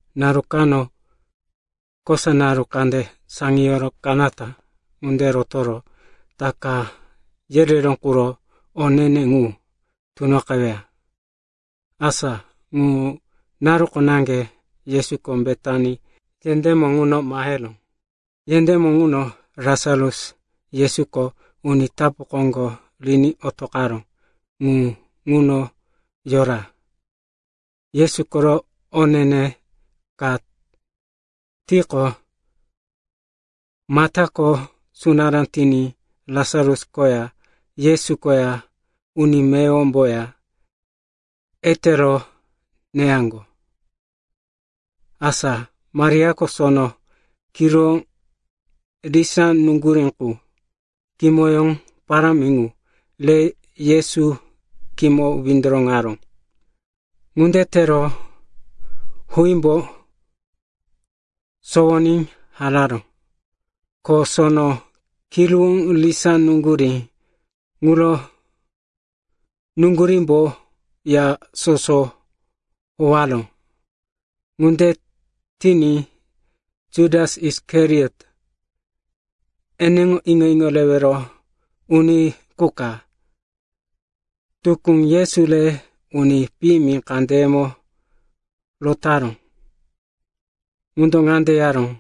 Naru kano, kosa naru kande saŋiyoro kanata ŋunde rotoro Taka yereró quro o ne-ne ŋu tunoqeweya. Asa ŋu naruko naŋge Yesuko Betani yendémo ŋuno maheró. Yendémo ŋuno Lasarus, Yesuko uni tapu koŋgo riní otoqaró ŋu ŋuno yora. Yesu koro o ne-ne ka tiqo, Matako sunará tiní Lasarus koya Yesu koya uni meyowomboya etero neyaŋgo. Asa Mariako sono kiruwó risá nuŋgurí qu, kimoyó parámi ŋu re Yesu khímo windoroŋaró. Ŋunde tero huímbo sowoní hararó. Ko sono kiruwó risá nuŋgurí ŋuro nuŋgurímbo ya soso howaró. Ŋunde tiní Jutas Isikariot, eneŋo iŋo-iŋo rewero uni qu ka tukú Yesu re uni piyimi kandeyemo rotaró, ŋundo ŋande yaró,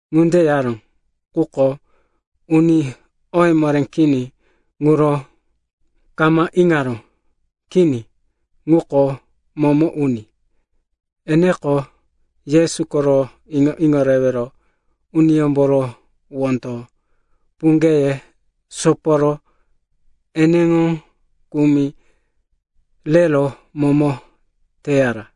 Ŋunde yaró, quko uni oye moré kini ŋuro kama iŋaró. Kini. Ŋuko momo uni. Eneko Yesu koro iŋo-iŋo rewero uniyómboro wondo puŋgeye soporo eneŋo kumi rero momo teyara.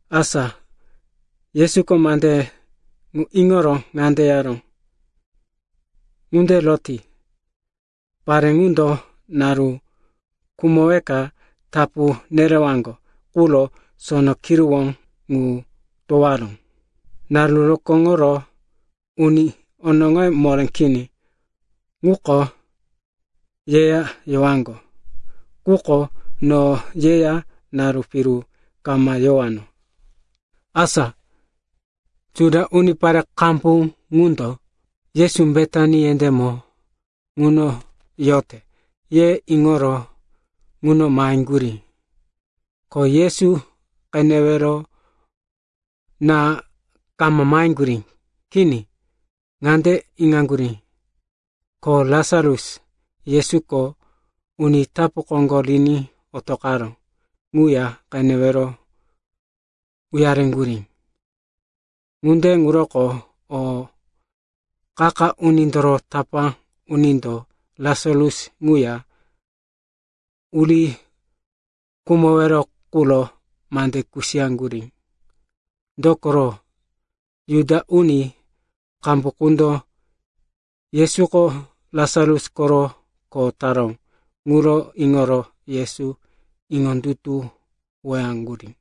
Asa Yesuko mande ŋu iŋoro ŋande yaró, “Ŋunde roti. Pare ŋundo naru khumoweka tapu nerewaŋgo quro sono kiruwó ŋu towoyaró. Naru rokóŋoro uni onoŋoye moré kini ŋuko yeya yowaŋgo. Quko no yeya naru piru kama yowano.” Asa Juda unipare qambu ŋundo, Yesu Betani yendémo ŋuno yote, ye iŋoro ŋuno maheŋgurí. Ko Yesu qenewero na kama maheŋgurí. Kini, ŋande iŋaŋgurí, ko Lasarus, Yesuko uni tapu koŋgo riní otoqaró, ŋuya qenewero uyareŋgurí. Ŋunde ŋuroko o qa-qa unindoro tapá unindo Lasarus ŋuya uri khumowero quro mande kusiyaŋgurí, dokoro, Juda uni qambu qundo Yesuko Lasarus koro kho taró ŋuro iŋoro Yesu iŋondutuwoyaŋgurí.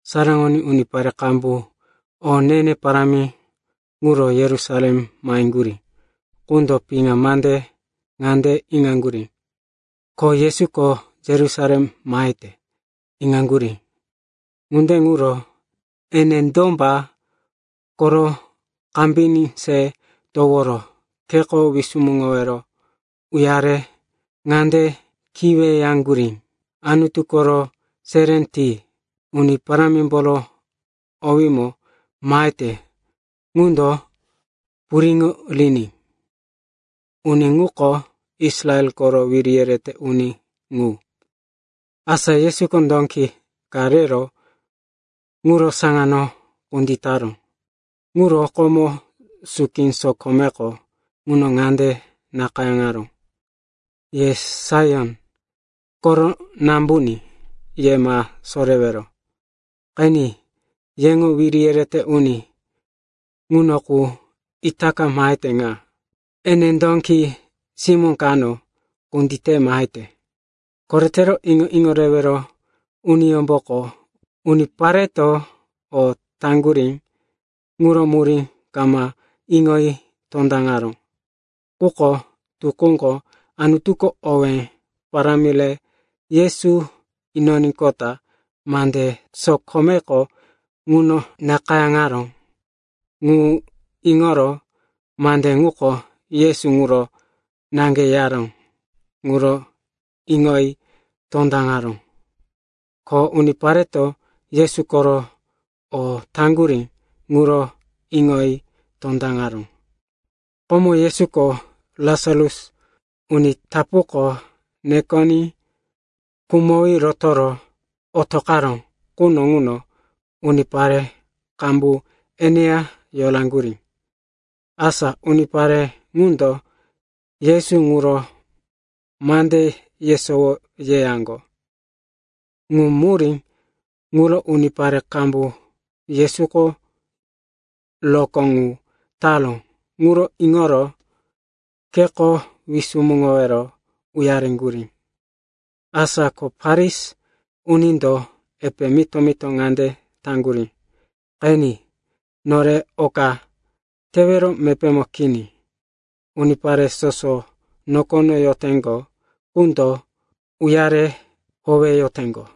Saraŋoní unipare qambu o ne-ne parámi quro Yerusalem maheŋgurí ŋundo piŋa mande ŋande iŋaŋgurí, ko Yesuko Yerusalem mahete, iŋaŋgurí. Ŋunde ŋuro ene domba koro kambiní se toworo kheko wisumuŋowero uyare ŋande kiweyaŋgurí, “Anutu koro seré ti. Uni Parámimboro owímo mahete ŋundo puriŋo riní. Uni ŋuko Israel koro wiri yerete uni ŋu.” Asa Yesuko dóki ka rero ŋuro saŋano kunditaró. Ŋuro komo suki sokomeko ŋuno ŋande nakayáŋaró, “Ye Saion koro Nambuní, ye ma sorewero. Qeni. Yeŋo wiri yerete uni ŋuno qu itaka mahete ŋa. Ene dóki simó kano kundite mahete.” Koretero iŋo-iŋo rewero uniyómboko unipareto o taŋgurí ŋuro murí kama iŋoyi tondaŋaró. Quko tukúko Anutuko owé parámi re Yesu inoníqota mande sokomeko ŋuno nakayáŋaró ŋu iŋoro mande ŋuko Yesu ŋuro naŋge yaró ŋuro iŋoyi tondaŋaró, ko unipareto Yesu koro o taŋgurí ŋuro iŋoyi tondaŋaró. Komo Yesuko Lasarus uni tapuko nekoní khumowí rotoro otoqaró quno ŋuno unipare qambu eneya yoraŋgurí. Asa unipare ŋundo Yesu ŋuro mande yesowo yeyaŋgo. Ŋu murí ŋuro unipare qambu Yesuko rokó ŋu taró ŋuro iŋoro kheko wisumuŋowero uyareŋgurí. Asa ko Farisi unindo epe mito-mito ŋande taŋgurí, “Qeni, nore oka tewero mepémo kini. Unipare soso nokono yoteŋgo qundo uyare howeyoteŋgo.”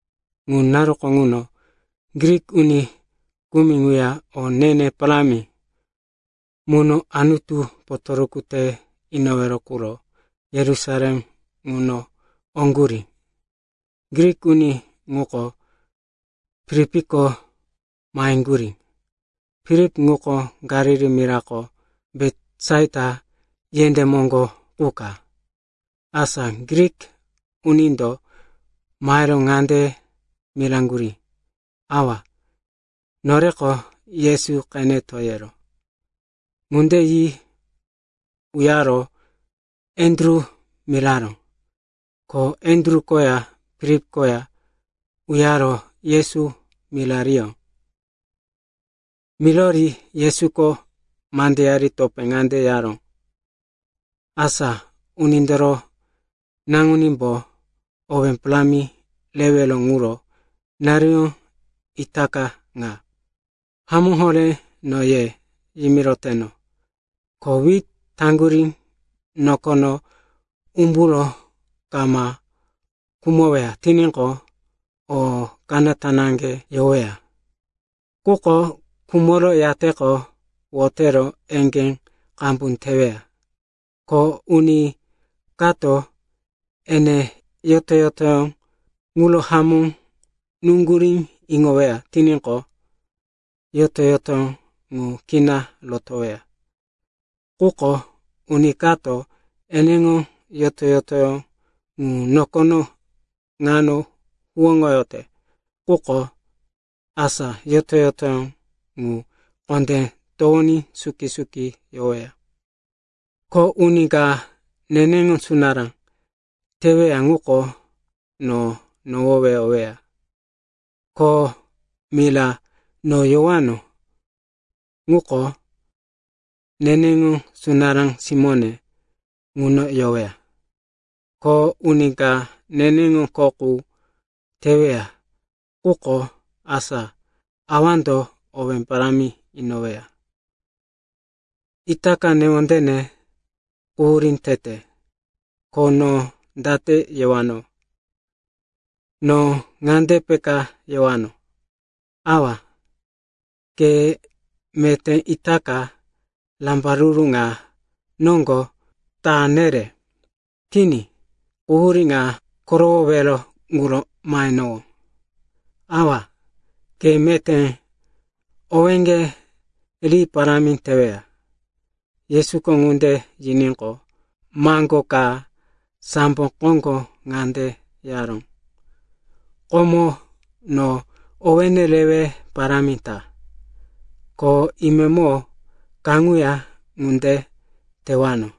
Ŋu naruko ŋuno Grik uni kumi ŋuya o ne-ne parámi muno Anutu potoruku te inowero quro Yerusalem ŋuno oŋgurí. Grik uni ŋuko Filipko maheŋgurí. Filip ŋuko Galili mirako Betisaita yendé moŋgo qu ka. Asa Grik unindo mahero ŋande miraŋgurí, “Awa, noreko Yesu qeneto yero.” Ŋunde yi uyaro Andru miraró, ko Andru koya Filip koya uyaro Yesu mirariyó. Mirori Yesuko mandeyari topé ŋande yaró, “Asa Unindoro Naŋunímbo owé parámi rewero ŋuro naruyó itaka ŋa. Hamó horé no ye yimiroteno, ko wit taŋgurí nokono umburo kama khumoweya tiníqo, o kanata naŋge yoweya. Quko khumoro yateqo wotero eŋgé qambu teweya. Ko uni kato ene yoto-yotoyó ŋuro hamó nuŋgurí iŋoyoweya tiníqo, yoto-yotoyó ŋu kina rotoweya. Quko uni kato eneŋo yoto-yotoyó ŋu nokono ŋano huwóŋoyote quko, asa yoto-yotoyó ŋu kondé towoní suki-suki yoweya. Ko uni ka neneŋo sunará teweya ŋuko no nohoweyoweya. Ko mira no yowano ŋuko, neneŋo sunará simóne ŋuno yoweya. Ko uni ka neneŋo kho qu teweya quko, asa Awando owé parámi inoweya. “Itaka newondene quhurí tete. Ko no date yewano? No ŋande peka yewano, ‘Awa, ke meté itaka rambaruru ŋa noŋgo ta nere?’ Kini, quhurí ŋa korowowero quro mahenowó. Awa, ke meté owéŋge ri parámi teweya.” Yesuko ŋunde yiníqo, maŋgó ka sambo koŋgo ŋande yaró, “Komo no owéne rewe parámi ta, ko imemo kaŋuya ŋunde tewano.”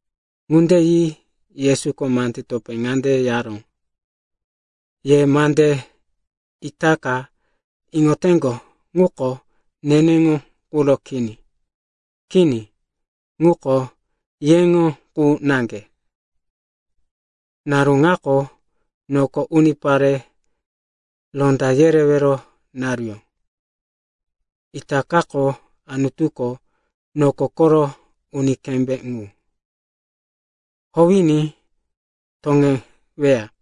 Ŋunde yi Yesuko mande topé ŋande yaró, “Ye mande itaka iŋoteŋgo ŋuko, neneŋo quro kini. Kini. Ŋuko yeŋo qu naŋge. Naru ŋako noko unipare ronda yerewero naruyó. Itakako Anutuko noko koro uni kembé ŋu howiní toŋeweya.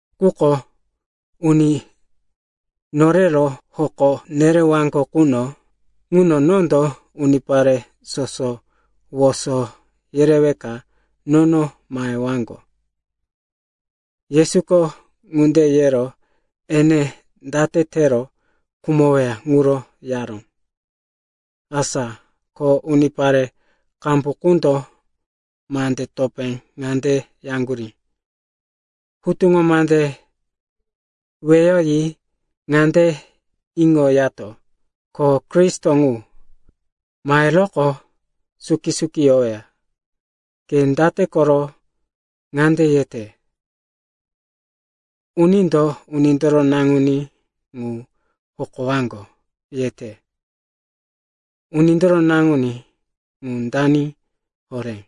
Quko uni norero hoko nerewaŋgo quno ŋuno nondo unipare soso woso yereweka nono mahewaŋgo.” Yesuko ŋunde yero ene date tero khumoweya ŋuro yaró. Asa ko unipare qambu qundo mande topé ŋande yaŋgurí, “Hutuŋo mande weyoyi ŋande iŋoyato, ko Kristo ŋu maheroqo suki-suki yoweya. Ke date koro ŋande yete, ‘Unindo Unindoro Naŋuní ŋu hokowaŋgo,’ yete? Unindoro Naŋuní ŋu dani horé?”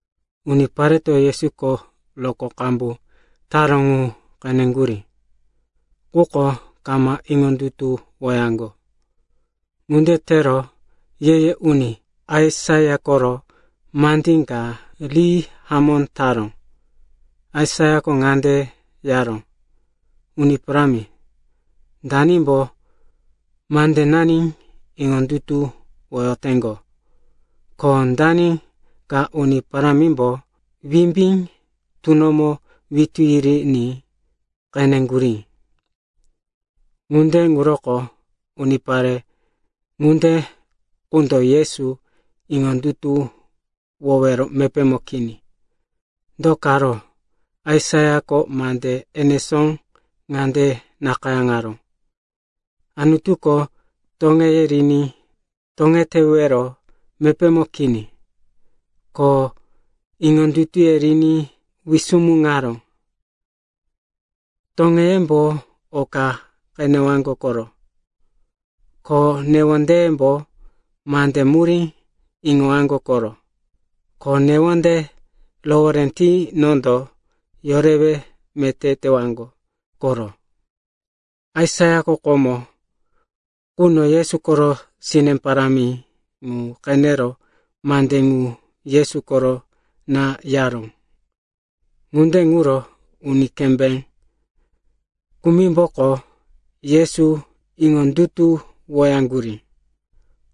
Unipareto Yesuko rokó qambu taró ŋu qeneŋgurí, quko kama iŋondutuwoyaŋgo. Ŋunde tero ye-ye uni Aisaia koro mandí ka ri hamó taró. Aisaiako ŋande yaró, “Uni Parámi, danimbo mandenani iŋondutuwoyoteŋgo? Ko dani ka Uni Parámimbo wimbí tunomo witú yiriní qeneŋgurí?” Ŋunde ŋuroko unipare ŋunde qundo Yesu iŋondutuwowero mepémo kini. Do karo Aisaiako mande enesó ŋande nakayáŋaró, “Anutuko toŋeye riní toŋetewero mepémo kini, ko iŋondutuye riní wisumuŋaró. Toŋeyembo oka qenewaŋgo koro, ko newondeyembo mande murí iŋowaŋgo koro, ko newonde rohoré ti nondo yorewe meté tewaŋgo koro.” Aisaiako komo quno Yesu koro sine parámi ŋu qenero mande ŋu Yesu koro na yaró. Ŋunde ŋuro uni kembé kumimboko Yesu iŋondutuwoyaŋgurí.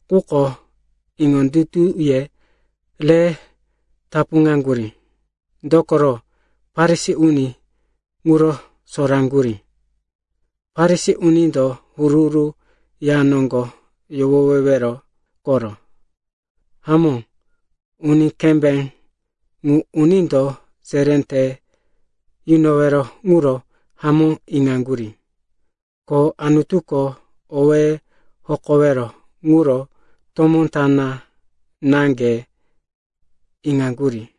Quko iŋondutuye re tapuŋaŋgurí, dokoro Farisi uni ŋuro soraŋgurí, Farisi unindo huru-huru ya noŋgo yohowewero koro. Hamó, uni kembé ŋu unindo seré te yunowero ŋuro hamó iŋaŋgurí, ko Anutuko owéye hokowero ŋuro tomó ta naŋge iŋaŋgurí.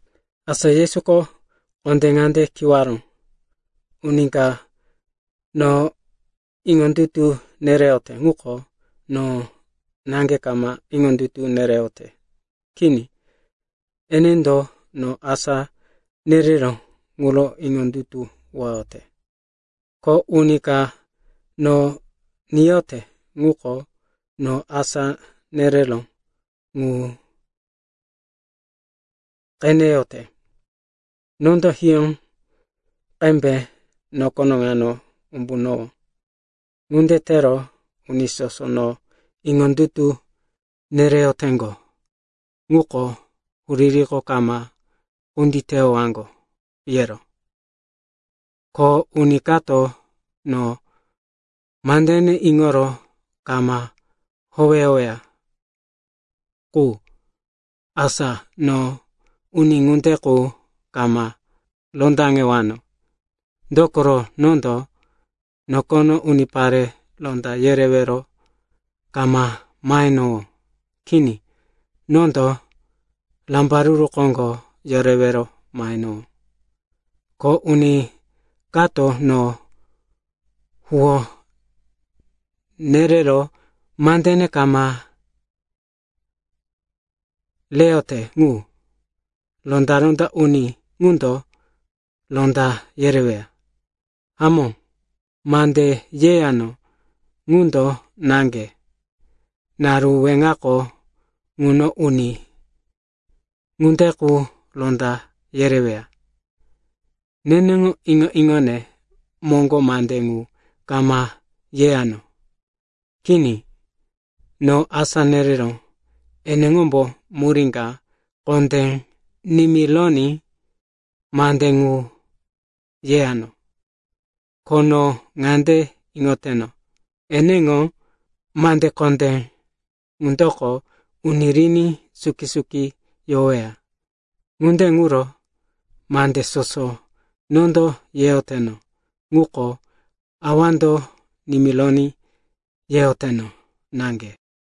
Asa Yesuko kondé ŋande kiwaró, “Uni ka no iŋondutu nereyote ŋuko no naŋge kama iŋondutu nereyote. Kini, enendo no asá nereró ŋuro iŋondutuwoyote. Ko uni ka no niyote ŋuko no asá nereró ŋu qeneyote. Nondo hiyó qembe nokono ŋano umbunowó. Ŋunde tero uni soso no iŋondutu nereyoteŋgo ŋuko huririko kama kunditeyowaŋgo yero. “Ko uni kato no mandene iŋoro kama howeyoweya qu, asa no uni ŋunde qu kama rondaŋewano. Dokoro nondo nokono unipare ronda yerewero kama mahenowó. Kini. Nondo rambaruru koŋgo yorewero mahenowó. Ko uni kato no huwó nerero mandene kama reyote ŋu, ronda-ronda uni ŋundo ronda yereweya. Hamó, mande yeyano ŋundo naŋge, naru weŋako ŋuno uni ŋunde qu ronda yereweya. Neneŋo iŋo-iŋone moŋgo mande ŋu kama yeyano. Kini. No asá nereró eneŋombo murí ka kondé nimironí mande ŋu yeyano. Ko no ŋande iŋoteno, eneŋo mande kondé ŋundoko uni riní suki-suki yoweya. Ŋunde ŋuro mande soso nondo yeyoteno, ŋuko Awando nimironí yeyoteno naŋge.”